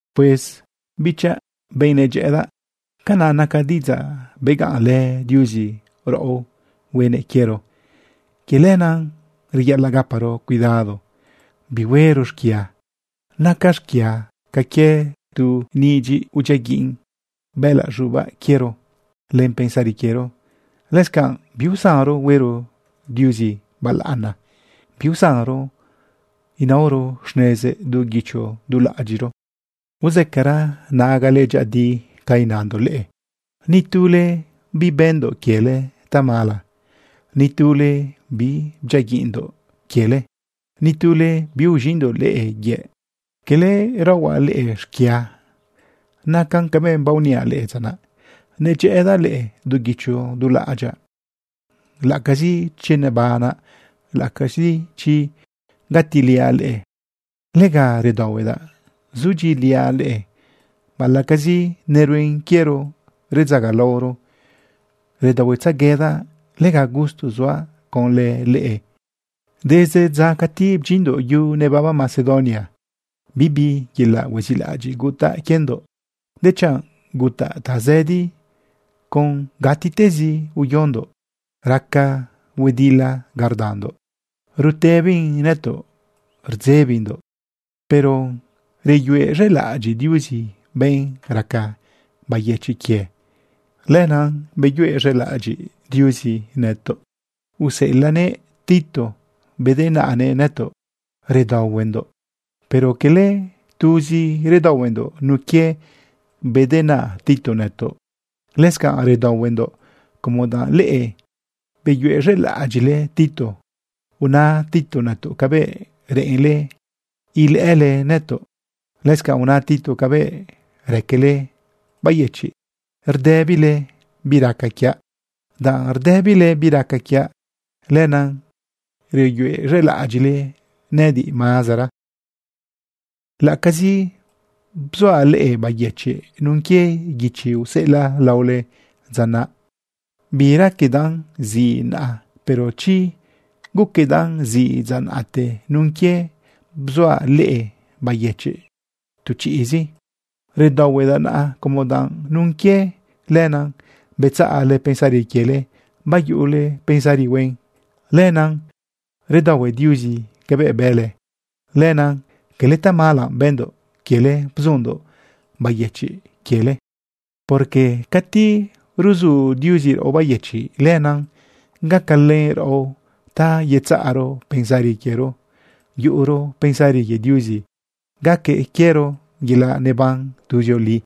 Pues bichaꞌ, benꞌ nedyëꞌëdaꞌ, canaꞌ naca diꞌidzaꞌ begaꞌnlë Diuzi raꞌo huenëꞌ quiero. Quie lenaꞌ reyaꞌalaꞌ gaparo cuidado bihuero xquia. Naca xquia ca quie tu nidyiꞌ udyiaguiꞌn bëꞌëlaꞌ z̃ubaꞌ quiero len pensari quiero. Lëscanꞌ biusanro huero Diuzi balaꞌana, biusanro naoro xnezëꞌ du guicho du laꞌ adyiꞌro. Uzëcara nagale dyëꞌëdi ca inandoꞌ leꞌe. Ni tule bibëndoꞌ quiele tamala. Ni tule bibdyiaguiꞌndoꞌ quiele. Ni tule biuz̃iꞌndoꞌ leꞌe yëꞌ. Cala raohuaꞌ leꞌe xquia. Nacan cabëꞌ baoniaꞌ leꞌe dza naꞌ, nedyëꞌëdaꞌ leꞌe du guicho du laꞌadyaꞌ, laꞌacazi chi nebanaꞌ, laꞌacazi chi gatiliaꞌ leꞌe. Lega redaohuedaꞌ zudyiꞌiliaꞌ leꞌe. Baꞌalaꞌcazi neruen quiero redzagalaoro, redaohuetzeguedaꞌ. Lega gusto suaꞌ conlë leꞌe. Desde dza cati bdyindoꞌ yu nebaba Macedonia, bibi yelaꞌ huezilaꞌadyiꞌ gutaꞌ quiendoꞌ, dechanꞌ gutaꞌ tazëdi con gatiꞌtezi uyondoꞌ. Raca huedila ga rdandoꞌ, rutëbin nëtoꞌ rdzebindoꞌ. Pero reyuez̃elaꞌadyiꞌ Diuzi benꞌ raca bayëchiꞌ quie. Lenaꞌ beyuez̃elaꞌadyiꞌ Diuzi nëtoꞌ, useꞌelaꞌnëꞌ Tito bedenaꞌnëꞌ nëtoꞌ redaohuendoꞌ. Pero cala tuzi redaohuendoꞌ nun quie bedenaꞌ Tito nëtoꞌ, lëscanꞌ redaohuendoꞌ como danꞌ leꞌe beyuez̃elaꞌadyiꞌle Tito. Una Tito nëtoꞌ cabëꞌ reꞌenle ilëꞌële nëtoꞌ. Lëscanꞌ una Tito cabëꞌ raquele bayëchiꞌ rdëbile bi raca quiaꞌ. Danꞌ rdëbile bi raca quiaꞌ, lenaꞌ reyuez̃elaꞌadyiꞌle nëꞌëdiꞌ mazara. Laꞌacazi bzuaꞌ leꞌe bayëchiꞌ nun quie guichi useꞌelaꞌ laole dza naꞌ, biraquedaꞌn ziꞌ naꞌa. Pero chi guquedaꞌn ziꞌ dza naꞌte nun quie bzuaꞌ leꞌe bayëchiꞌ tu chiꞌzi, redaohuedaꞌ naꞌa como danꞌ nun quie lenaꞌ, betzaꞌle pensari quiele bayuꞌule pensari huen. Lenaꞌ redaohue Diuzi cabëꞌ bële. Lenaꞌ cala tamala bëndoꞌ quiele bzundoꞌ bayëchiꞌ quiele. Porque cati ruzu Diuzi raꞌo bayëchiꞌ, lenaꞌ gacalën raꞌo ta yetzaꞌro pensari quiero, yuꞌuro pensari quie Diuzi, gaque quiero yelaꞌ neban tuzioli.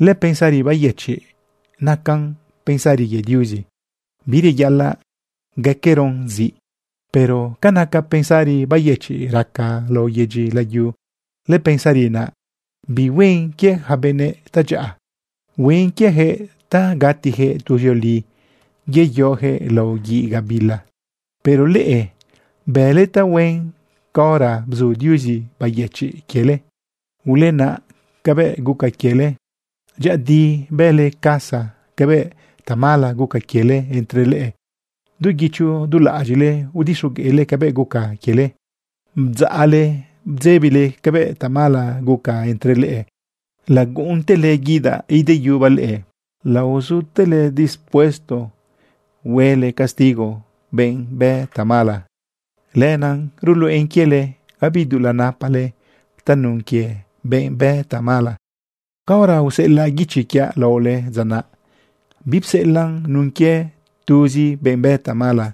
Lëpensari bayëchiꞌ nacan pensari quie Diuzi, bireyaꞌalaꞌ gaqueroꞌn ziꞌ. Pero ca naca pensari bayëchiꞌ raca lao yedyi layu, lëpensari naꞌ bihuen quie ja benëꞌ tadyaꞌa. Huen quiejëꞌ ta gatijëꞌ tuzioli yeyojëꞌ lao guiꞌ gabila. Pero leꞌe bële tahuen caora bzu Diuzi bayëchiꞌ quiele. Ulenaꞌ cabëꞌ guca quiele. Dyëꞌëdi bële casa cabëꞌ tamala guca quiele entre leꞌe. Du guicho du laꞌadyiꞌle udixogueꞌle cabëꞌ guca quiele. Bdzaꞌle bdzebile cabëꞌ tamala guca entre leꞌe. Laguꞌuntele guidaꞌ ideyubaꞌ leꞌe. Laozutele dispuesto huele castigo benꞌ bë tamala. Lenaꞌ ruluꞌen quiele gabi dulaꞌ napale tanun quie benꞌ bë tamala. Caora useꞌelaꞌ guichi quiaꞌ laole dza naꞌ, bipseꞌelaꞌn nun quie tuzi benꞌ bë tamala,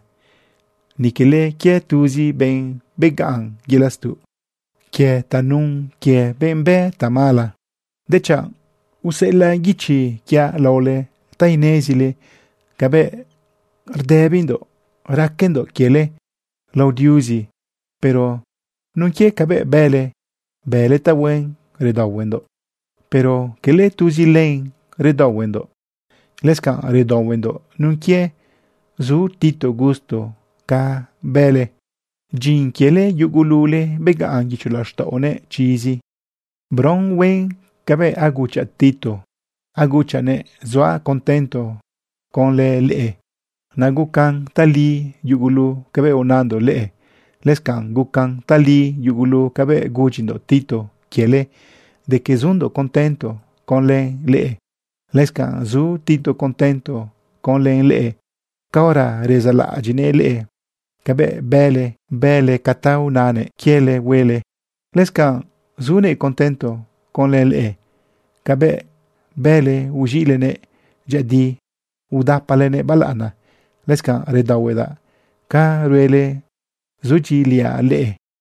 ni quele quie tuzi benꞌ begaꞌn yelaꞌ stuꞌ quie tanun quie benꞌ bë tamala, dechanꞌ useꞌelaꞌ guichi quiaꞌ laole ta inezile cabëꞌ rdëbindoꞌ raquendoꞌ quiele lao Diuzi. Pero nun quie cabëꞌ bële, bële tahuen redaohuendoꞌ. Pero quele tuzi len redaohuendoꞌ, lëscanꞌ redaohuendoꞌ nun quie zu Tito gusto ca bële. Dyin quiele yugulule begaꞌn guicho laxtaꞌonëꞌ chizi. Bron huen cabëꞌ aguchaꞌ Tito, aguchaꞌnëꞌ zuaꞌ contento conlë leꞌe. Naꞌ gucan tali yugulu cabëꞌ unandoꞌ leꞌe, lëscanꞌ gucan tali yugulu cabëꞌ gudyindoꞌ Tito quiele de que zundoꞌ contento conlë leꞌe. Lëscanꞌ zu Tito contento conlë leꞌe caora rezaꞌlaꞌadyiꞌnëꞌ leꞌe cabëꞌ bële, bële ca ta unanëꞌ quiele huele. Lëscanꞌ zunëꞌ contento conlë leꞌe cabëꞌ bële uz̃iꞌlenëꞌ dyëꞌëdi udapalenëꞌ balaꞌana. Lëscanꞌ redaohuedaꞌ ca ruele zudyiꞌiliaꞌ leꞌe.